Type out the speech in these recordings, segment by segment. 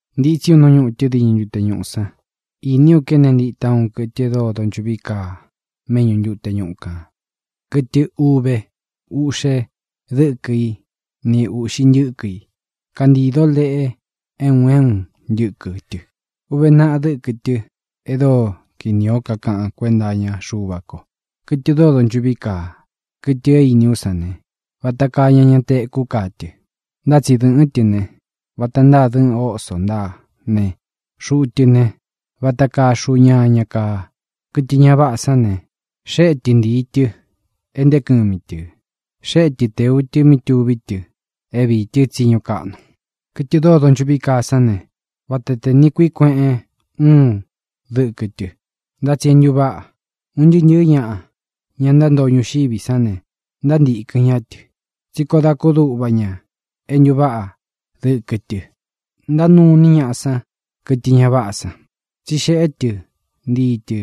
Ntītsí u nú ñutɨ diñɨ ntute ñúꞌu san, īní u kéne ntita úun kɨtɨ e dóo donchuꞌví kaa méꞌñu ntute ñuꞌu kān, kɨtɨ uve uꞌxe dɨ́kɨ í ni ūꞌxi ntɨ́kɨ i. Kántīdó leꞌe é un é un ntɨ́kɨ tɨ. Uve naꞌa dɨ́kɨ tɨ e dóo kinī ó kakaꞌan kuénta iña Xuva ko. Kɨtɨ dóo donchuꞌví kaa, kɨtɨ é īní u sán ne, vata kaa ñaña tekú kaa tɨ. Ntá tsi dɨ́ꞌɨn tɨ̄ ne, vata ntáa dɨꞌɨn oso ntáa ne, xuꞌu tɨ ne, vata kaa xuꞌu ñaña kaa. Kɨtɨ ña váꞌā sán ne, xéꞌe tɨ ntii tɨ̄ é ntēé kɨmi tɨ̄. Xéꞌe tɨ tēu tɨ mí tuví tɨ é viī tɨ́ tsiñu kaꞌnu. Kɨtɨ dóo donchuꞌví kaa sán ne, vata tē niꞌi kuíꞌi kueꞌen úun dɨkɨ tɨ, ntá tsi é ntuváꞌa. Un ntɨɨ́ ntɨ̄ɨ́ ñaꞌa, ña ntántoo ñuxiví san ne, ntántīkɨn ñá tɨ, tsí koo da kúduꞌva ña é ntuváꞌa dɨ́kɨ tɨ. Ntánuu iní ñaꞌa san kɨtɨ ña váꞌā san, tsí xeꞌé tɨ ntii tɨ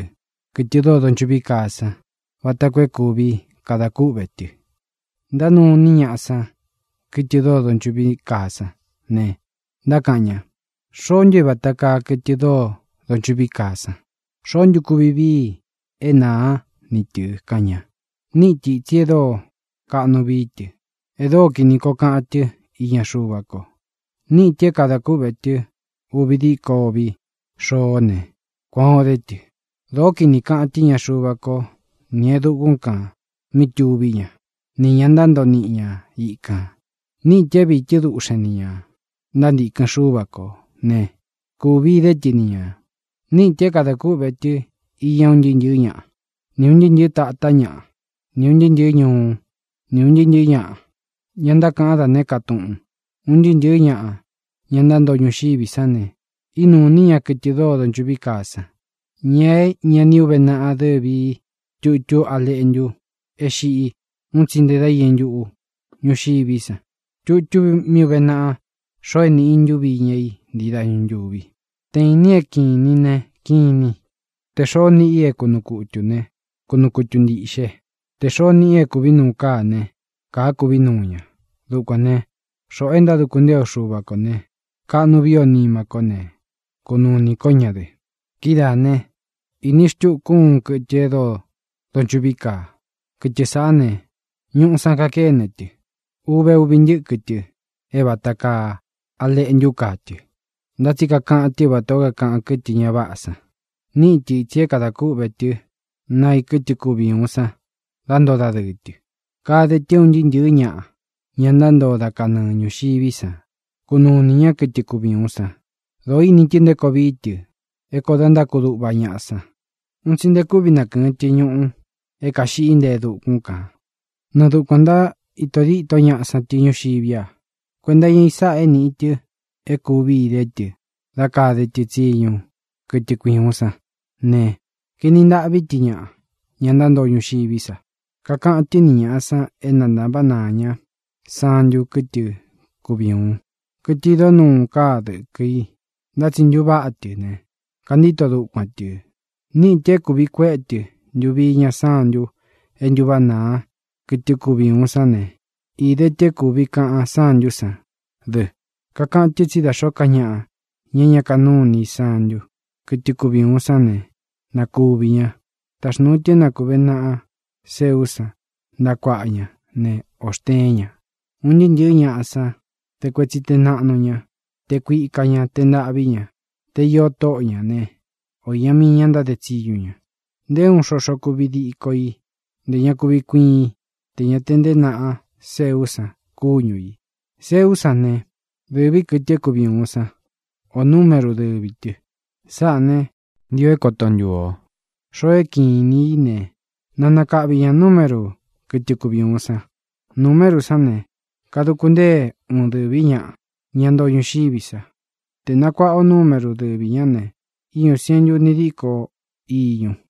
kɨ̄tɨ dóo donchuꞌví kaa san vata koo é kuvi kada kúꞌvē tɨ. Ntánuu iní ñaꞌa san kɨtɨ dóo donchuꞌví kaa san ne, ntákaꞌan ña: —¿Xoó ntu é vata kaa kɨtɨ dóo donchuꞌví kaa san? ¿Xoó ntu kuvi vií i é nāá ni tɨ̄? —kaꞌan ña. Níꞌi tɨ ītsi e dóo kaꞌnu vií tɨ, e dóo kini koo kaꞌan tɨ́ iña Xuva ko. Níꞌi tɨ̄ é kadā kúꞌvē tɨ uvi díko uvi xoó ne, kuan ō dé tɨ. Dōó kini kaꞌan tɨ́ iña Xuva ko ni e dukún kān mí tuví ña, nī ña ntántoo ni ña ikān. Níꞌi tɨ̄ é viī tɨ́ duꞌxen nī ña ntántīkɨn Xúva kō né, kūvi idé tɨ ni ñā. Níꞌi tɨ̄ é kadā kúꞌvē tɨ iña un ntɨɨ́ ntɨ̄ɨ́ ñaꞌa, ni ūn ntɨɨ́ ntɨ̄ɨ́ tātá ñaꞌa, ni ūn ntɨɨ́ ntɨ̄ɨ́ ñuú, ni ūn ntɨɨ́ ntɨ̄ɨ́ ñaꞌa, ña ntákaꞌan dá nēé ka túꞌūn. Un ntɨɨ́ ntɨ̄ɨ́ ñaꞌa, ña ntántoo ñuxiví san ne, ínūu iní ña kɨtɨ dóo donchuꞌví kaa san, ña é ña ni uvé naꞌa dɨ́vi i tutú A Leꞌntu é xiꞌí un tsi nte da iñɨ ntúꞌu ñuxiví san, tutú mí uve naꞌa xoo e níꞌi i ntuvi íña i ntii dañu ntúvi. Te īnín é kīnin ne, kinin. Tē xoó niꞌi i é kunuu kutū né, kunuu kutu ntīꞌxe. Tē xoó niꞌi i é kūví nuu káa ne, kāá kuví nuu ña. Dukuān né, xoꞌō e ntáduku ntée o Xuva kō ne, kaꞌnu viī ó nima kó ne, kunūu ini ko ñá dɨ. Kidáā né, īní xtuku u úun kɨtɨ e dóo donchuꞌví kaa. Kɨtɨ sāꞌá ne, ñuꞌu san kakéne tɨ. Uve uvi ntɨ́kɨ tɨ é vata kaa a leꞌntú kaa tɨ, ntá tsi kakaꞌan tɨ́ vatā ó kakaꞌan kɨ́tɨ ña váꞌā san. Níꞌi tɨ ītsi é kadā kúꞌvē tɨ́ naa i kɨtɨ kuvi ūun san dá ntoo dadɨɨ tɨ. Kade tɨ é un ntɨɨ́ ntɨ̄ɨ́ ñaꞌa, ña ntántoo dá kanɨɨ ñūxiví san, kunuu inī ñá kɨtɨ kuvi ūun san. Dōo ini tɨ nté koo vií tɨ é kōo dá ntákudūꞌva ñaꞌa san. Un tsi nte kúvi nakɨ̄ɨn tɨ ñuꞌu é kaīꞌxi nte e dukún kan nɨɨ dukuān ntaíto dîtó ñaꞌa san ñuxiví a. Kuenta iña i sáꞌā é nīꞌi tɨ e kúvi idé tɨ dá kade tɨ tsiñu kɨtɨ kui ūun sán ne, kaeni ntaꞌví tɨ ñaꞌa, ña ntántoo ñuxiví sa. Kakaꞌan tɨ́ ni ñāꞌa san é na ntāváꞌa naa ñá santu kɨ́tɨ kuvi ūun, kɨtɨ idó nuu káa dɨ̄kɨ i, ntá tsi ntuváꞌa tɨ ne, kantíto dukuan tɨ̄. Níꞌi tɨ̄ é kūvi kuéꞌe tɨ ntuvi iña santu e ntúváꞌa naa kɨtɨ kuvi ūun sán ne, īde tɨ é kūvi kaꞌan sántu sán dɨ. Kakaꞌan tɨ́ tsí da xōó ka ñaꞌa, ña é ña kanúu iní i santu, kɨ́tɨ kuvi ūun sán ne, na kuvī ña. Taxnūu tɨ é na kūvé naꞌa seú san ntaꞌa kuaꞌa ña ne, ō xteén ña, un ntɨɨ́ ntɨ̄ɨ́ ñaꞌa san, te kuetsi te naꞌnu ña, te kuika ñā, te ntaꞌvī ñá, te īó tóꞌo ña ne, ō iña mii ña ntáde tsiñu ña. Nté uun xoxo kuvi díko i, ntē ña kuvi kuiin í, tē ña te ntée naꞌa seú san kúñu ī. Seú san ne, dɨ̄ví kɨtɨ é kuvi ūun sán, ō numéru dɨvī tɨ. Sáꞌā ne, ntio é koto ntuu ō. Xoo é kiꞌin inī í ne, na nakaꞌvi ñā numéru kɨ́tɨ kuvi ūun san. Numéru sán ne, kaduku ntée uun dɨ̄ví ñaꞌa, ña ntoo ñuxiví sa. Te nakuaꞌa ō numéru dɨvī ñá ne, íñū sientu uni díko iñu.